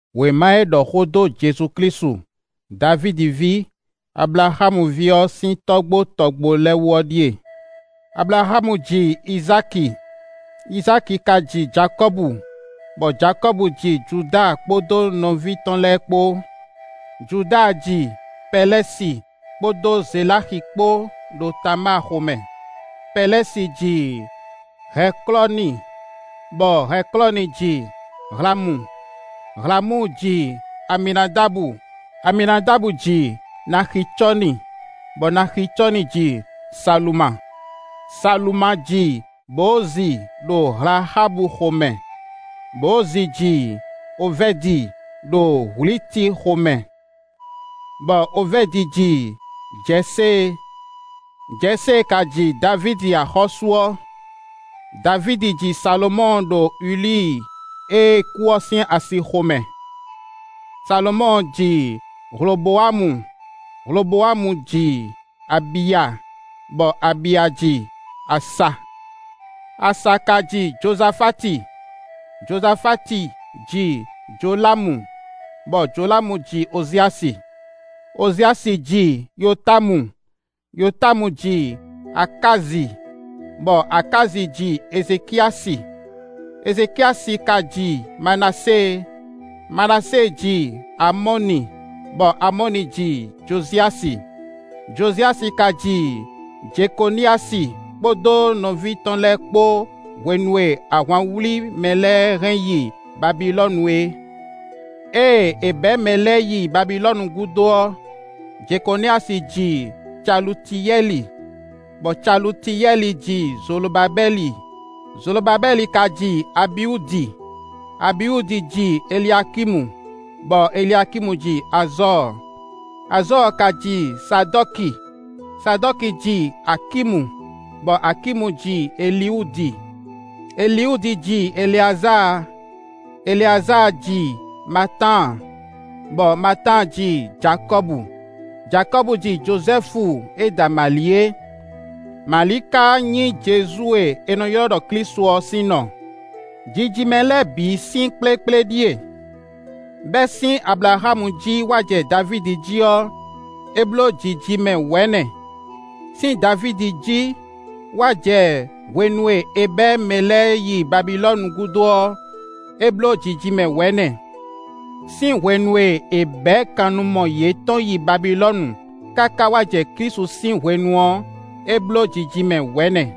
Wěma e ɖɔ xó dó Jezu Klísu, Davídi ví, Ablaxámu ví ɔ́ sín tɔ́gbó tɔgbo lɛ́ɛ wú ɔ́ ɖíe: Ablaxámu ji Izáki, Izáki ka ji Jakɔ́bu, bɔ Jakɔ́bu ji Juda kpódó nɔví tɔn lɛ́ɛ kpó. Juda ji Pɛlɛ́si kpódó Zeláxi kpó ɖo Tamáa xomɛ; Pɛlɛ́si ji Hɛklɔ́ni, bɔ Hɛklɔ́ni ji Alamu; Hlamu ji Aminadabu, Aminadabu ji Naxicɔ́ni, bɔ Naxicɔ́ni ji Saluma. Saluma ji Bowozi ɖo Hlaxábu xomɛ; Bowozi ji Ovɛ́di ɖo Hwliti xomɛ, bɔ Ovɛ́di ji Jɛsée; Jɛsée ka ji Davídi axɔ́sú ɔ́. Davídi ji Salomɔ́ɔ ɖo Ulíi e kú ɔ́ sín asi xomɛ; Salomɔ́ɔ ji Hlobowámu; Hlobowámu ji Abiya, bɔ Abiya ji Asa. Asa ka ji Jozafáti; Jozafáti ji Jolámu, bɔ Jolámu ji Oziasi. Oziasi ji Yotámu, Yotámu ji Akázi, bɔ Akázi ji Ezekiyási; Ezekiyási ka ji Manasée; Manasée ji Amɔ́ni, bɔ Amɔ́ni ji Joziyási; Joziyási ka ji Jekoniyási kpódó nɔví tɔn lɛ́ɛ kpó hwenu e ahwan wlí mɛ lɛ́ɛ hɛn yi Babilɔ́nu é. Ée è bɛ̌ mɛ lɛ́ɛ yi Babilɔ́nu gúdo ɔ́, Jekoniyási ji Calutiyɛ́li, bɔ Calutiyɛ́li ji Zolobabɛ́li; Zolobabɛ́li ka ji Abiwúdi; Abiwúdi ji Eliakímu, bɔ Eliakímu ji Azɔ́ɔ; Azɔ́ɔ ka ji Sadɔ́ki; Sadɔ́ki ji Akímu, bɔ Akímu ji Eliwúdi; Eliwúdi ji Eleazáa; Eleazáa ji Matáan, bɔ Matáan ji Jakɔ́bu; Jakɔ́bu ji Jozɛ́fu e da Mali é; Mali ka nyí Jezu e è nɔ ylɔ́ ɖɔ Klísu ɔ́ sín nɔ. Jijimɛ lɛ́ɛ bǐ sín kplékplé ɖíe: bɛ́ sín Ablaxámu jí wá jɛ Davídi jí ɔ́, é bló jijimɛ wɛ̌nɛ; sín Davídi jí wá jɛ hwenu e è bɛ̌ mɛ lɛ́ɛ yi Babilɔ́nu gúdo ɔ́, é bló jijimɛ wɛ̌nɛ; sín hwenu e è bɛ̌ kannumɔ yětɔn yi Babilɔ́nu káká wá jɛ Klísu sín hwenu ɔ́, é bló jijimɛ wɛ̌nɛ.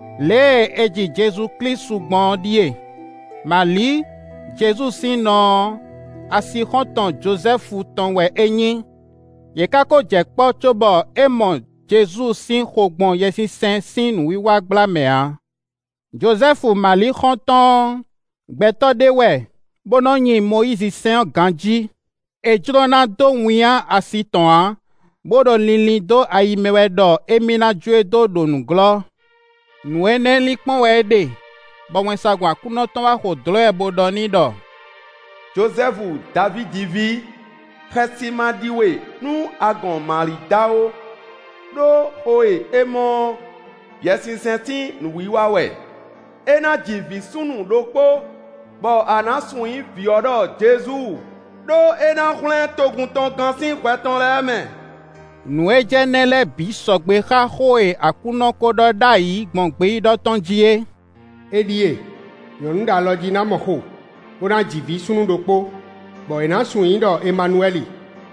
Lě e è ji Jezu Klísu gbɔn ɔ́ ɖíe: Mali, Jezu sín nɔ ɔ́, asixɔ́ntɔn Jozɛ́fu tɔn wɛ é nyí; yě ká kó jɛ kpɔ́ cóbɔ é mɔ Jezu sín xo gbɔn Yɛsinsɛn sín nǔwiwa gbla mɛ ǎ. Jozɛ́fu Mali xɔ́ntɔn ɔ́, gbɛtɔ́ ɖé wɛ, bó nɔ́ nyi Mɔyízisɛ́n ɔ́ ganjí. É jló ná dó winnyá asi tɔn ǎ, bó ɖo linlin dó ayi mɛ wɛ ɖɔ émí ná jó e dó ɖo nǔglɔ́. Nǔ énɛ́ lin kpɔ́n wɛ é ɖe, bɔ wɛnsagun Aklúnɔ tɔn wá xo dlɔ̌ ɛ bó ɖɔ n'i ɖɔ: “Jozɛ́fu Davídi ví, xɛsi ma ɖi we, nú a gɔn Mali da ó; ɖó xo e é mɔ ɔ́, Yɛsinsɛn sín nǔwiwa wɛ. É ná ji vǐ súnnu ɖokpó, bɔ a nǎ sun nyǐ vǐ ɔ́ ɖɔ Jezu, ɖó é ná hwlɛ́n togun tɔn gán sín hwɛ tɔn lɛ́ɛ mɛ.” Nǔ e jɛ nɛ́ lɛ́ɛ bǐ sɔgbe xá xó e Aklúnɔ kó ɖɔ ɖ'ayǐ gbɔn gbeyíɖɔ tɔn jí é: “É ɖíe, nyɔ̌nu ɖo alɔjí ná mɔ xo, bó ná ji vǐ súnnu ɖokpó, bɔ è nǎ sun nyǐ i ɖɔ Emanuwɛ́li.”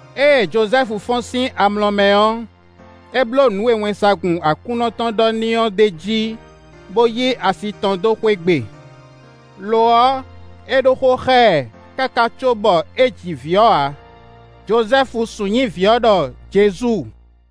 Ée Jozɛ́fu fɔ́n sín amlɔ mɛ ɔ́, é bló nǔ e wɛnsagun Aklúnɔ tɔn ɖɔ n'i ɔ́ ɖ'é jí, bó yí asi tɔn dó xwé gbe. Lo ɔ́, é ɖó xó xá ɛ, káká cóbɔ é ji vǐ ɔ́ ǎ. Jozɛ́fu sun nyǐ vǐ ɔ́ ɖɔ Jezu.